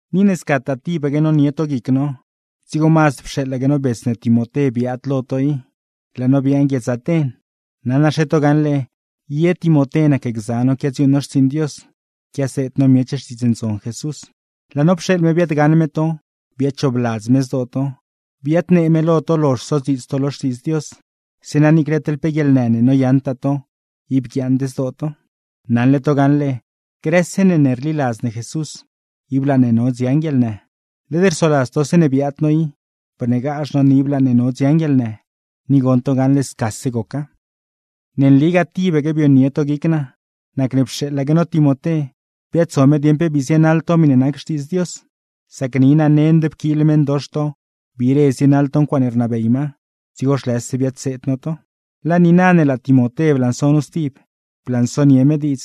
Ni ne scataa tibaque nonie to guic no, dzigo mazd pxeeḻaque no bets ne Timoté biaad lo to i, laa no biaaṉ guiedz Aten. (Naṉaxe to gaṉle ye Timoté nacgza no quiadziuuṉ no xtsiiṉ Dios, quiaseed no miech Xtiidz Ndzon Jesús.) Laa no pxeeḻ me biaadgaṉ me to, biadchoobladz me zdoo to, biadnee me lo to lozh sodziits to lo Xtiidz Dios; zeeṉa niicle teḻ pe guieḻnë ne noyaṉtaa to, ib guiaaṉd zdoo to. Naṉle to gaṉle grëse ne ne rliladz ne Jesús, ib laa ne no dziaṉ guieḻnë. Led rsoladz to zeeṉe biaad no i, bneegazh no ne ib laa ne no dziaṉ guieḻnë; ni goṉ to gaṉle scase goca. Ne nligaa tibaque bionie to guic naa, nacne mazd pxeeḻaque no Timoté, biaadso me dieṉ pe bii zienaḻ to miṉe nac Xtiidz Dios; sac ni naa nend pquiil meṉdox to biire zienaḻ to ncuaaṉe rnabey ma, dzigo zhlëse biadseed no to. Laa niina ne laa Timoté blanso nu stib, blansonie me diidz,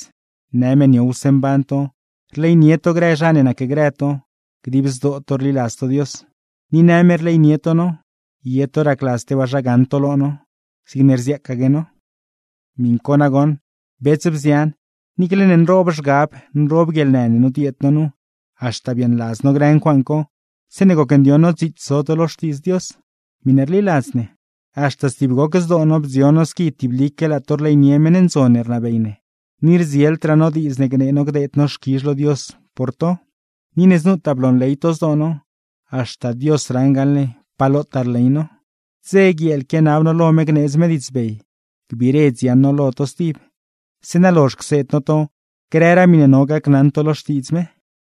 në me niowse mban to, rleynie to grë zha ne nacgrë to, dib zdoo to rliladz to Dios. Ni në me rleynie to no, ye to racladz tebaa zha gaṉ to lo no, zigne rziaacaque no. Miṉ co nagoṉ, bets, bzian, niicle ne nroob zhgab, nroob guieḻnë ne nodieed no nu, haxta biaaṉladz no grë ncuaaṉ co zeeṉe gocndioṉ no dziits zo to lo Xtiidz Dios, miṉe rliladz ne. Haxta stib goc zdoo no bdzion no squi tiblique laa to rleynie meṉ ndzon ne rnabey ne; ni rdzieldraa no diidz ne gnee no gdeed no xquizh lo Dios por to. Ni ne znutaa bloonley to zdoo no, haxta Dios raṉ gaṉle pa lotaa rley no. Dze, guieel, quianab no lo me gneedz me diidzbey gbiire dziaṉ no lo to stib; zeeṉa lozh cseed no to grëraa miṉe no gacnaṉ to lo Xtiidz me.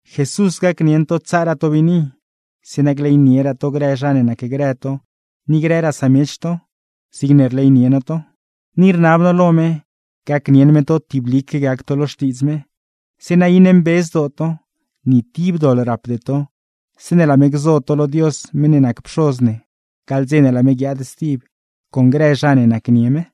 Jesús gacnieṉ to tsaaraa to biini, zeeṉa gleynieraa to grë zha ne nacgrë to ni grëraa samiech to, zigne rleynie no to. Ni rnab no lo me, gacnieṉ me to tiblique gac to lo Xtiidz me, zeeṉa iṉe mbe zdoo to, ni tib doḻ rapde to zeeṉe laa me gzo to lo Dios meṉ ne nac Pxoz ne, gaḻ dze ne laa me guiaad stib con grë zha ne nacnie me.